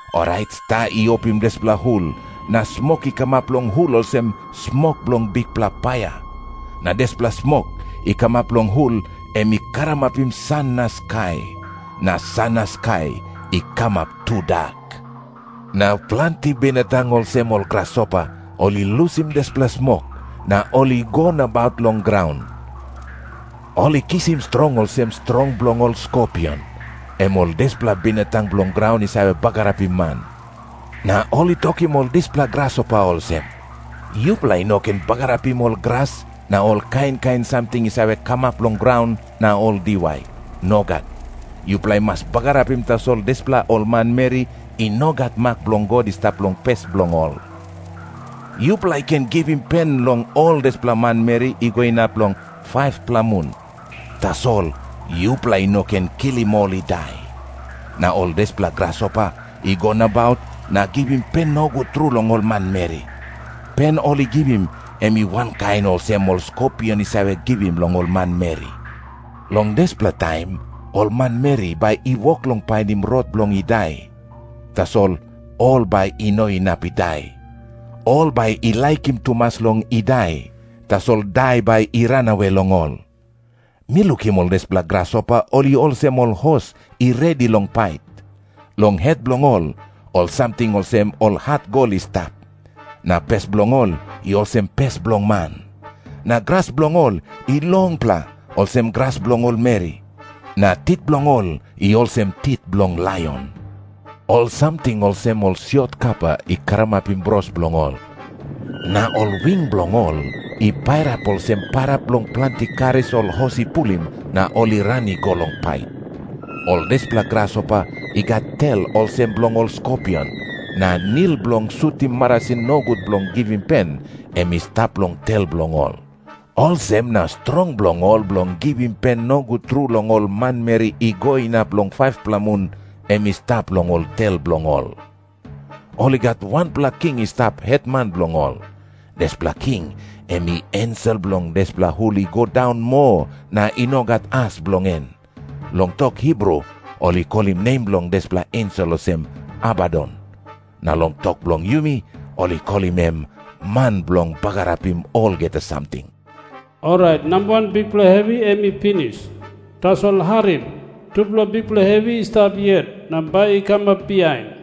Orait sta i opim dispela hul, na smok i kamap long hul olsem smok bilong bikpela paia. Na dispela smok i kamap long hul em i karamapim san na skai, na san na skai i kamap tudak. Na planti binatang olsem ol grasopa ol i lusim dispela smok, na ol i go nabaut long graun. Ol i kisim strong olsem strong bilong ol skopion, em ol dispela binatang bilong graun i save bagarapim man. Na ol i tokim ol dispela grasopa olsem, "Yupela i no ken bagarapim ol gras na ol kain kain samting i save kamap long graun na ol diwai. Nogat. Yupela i mas bagarapim tasol dispela ol manmeri i no gat mak bilong God i stap long pes bilong ol. Yupela i ken givim pen long ol dispela manmeri i go inap long 5-pela mun, tasol yupela i no ken kilim ol i dai." Na ol dispela grasopa i go nabaut na givim pen nogut tru long ol manmeri. Pen ol i givim em i wankain olsem ol skopion i save givim long ol manmeri. Long dispela taim ol manmeri bai i wok long painim rot bilong i dai, tasol ol bai i no inap i dai. Ol bai i laikim tumas long i dai, tasol dai bai i ranawe long ol. Mi lukim ol dispela grasopa ol i olsem ol hos i redi long pait. Long het bilong ol, ol samting olsem ol hat gol i stap. Na pes bilong ol i olsem pes bilong man. Na gras bilong ol i longpela, olsem gras bilong ol meri. Na tit bilong ol i olsem tit bilong laion. Ol samting olsem ol siot kapa i karamapim bros bilong ol, na ol wing bilong ol i pairap olsem pairap bilong planti karis ol hos i pulim na ol i ran i go long pait. Ol dispela grasopa i gat tel olsem bilong ol skopion, na nil bilong sutim marasin nogut bilong givim pen, em i stap long tel bilong ol. Olsem na strong bilong ol bilong givim pen nogut tru long ol manmeri i go inap long 5-pela mun, em i stap long ol tel bilong ol. Ol i gat wanpela king i stap hetman bilong ol. Dispela king em i ensel bilong dispela hul i go daun moa na i no gat as bilong en. Long tok Hibru ol i kolim nem bilong dispela ensel olsem, Abadon. Na long tok bilong yumi ol i kolim em Man Bilong Bagarapim Olgeta Samting. Orait namba wan bikpela hevi em i pinis. Tasol harim. Tupela bikpela hevi i stap yet na bai i kamap bihain.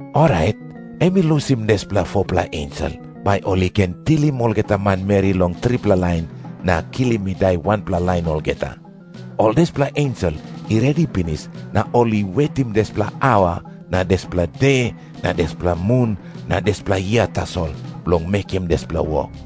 Orait em i lusim dispela 4-pela ensel, bai ol i ken tilim olgeta manmeri long tripela lain, na kilim i dai wanpela lain olgeta. Ol dispela ensel i redi pinis na ol i wetim dispela aua na dispela de na dispela mun na dispela yia tasol, bilong mekim dispela wok.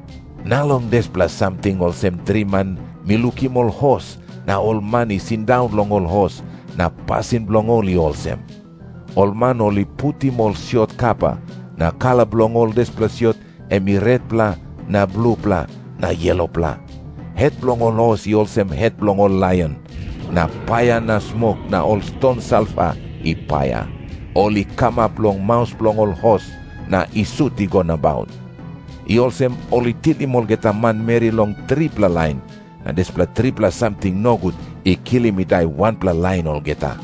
Na long dispela samting olsem driman mi lukim ol hos na ol man i sindaun long ol hos, na pasin bilong ol i olsem. Ol man ol i putim ol siot kapa, na kala bilong ol dispela siot em retpela na blupela na yelopela. Het bilong ol hos i olsem het bilong ol laion. Na paia na smok na ol ston salfa i paia, ol i kamap long maus bilong ol hos na i sut i go nabaut. I olsem ol i tilim olgeta manmeri long tripela lain, na dispela tripela samting nogut i kilim i dai wanpela lain olgeta.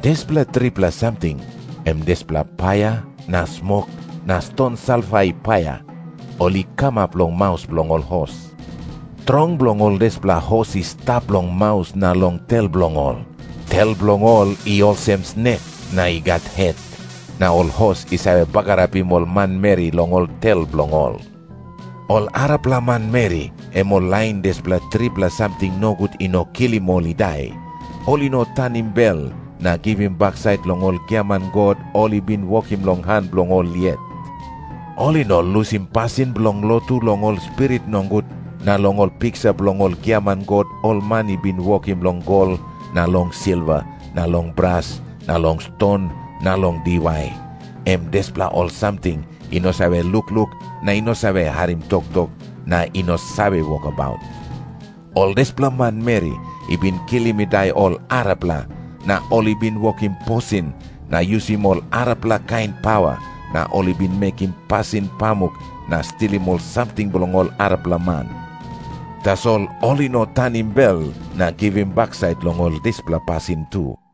Dispela tripela samting em dispela paia na smok na ston salfa i paia, ol i kamap long maus bilong ol hos. Strong bilong ol dispela hos i stap long maus na long tel bilong ol. Tel bilong ol i olsem snek, na i gat het. Na ol hos i save bagarapim ol manmeri long ol tel bilong ol. Ol arapela manmeri, em ol lain dispela tripela samting nogut i no kilim ol i dai, ol i no tanim bel na givim baksait long ol giaman god ol i bin wokim long han bilong ol yet. Ol i no lusim pasin bilong lotu long ol spirit nogut na long ol piksa bilong ol giaman god ol man i bin wokim long gol na long silva na long bras na long ston na long diwai, em dispela ol samting i no save lukluk na i no save harim toktok na i no save wokabaut. Ol dispela manmeri i bin kilim i dai ol arapela, na ol i bin wokim posin na yusim ol arapela kain pawa, na ol i bin mekim pasin pamuk na stilim ol samting bilong ol arapela man. Tasol ol i no tanim bel na givim baksait long ol dispela pasin tu.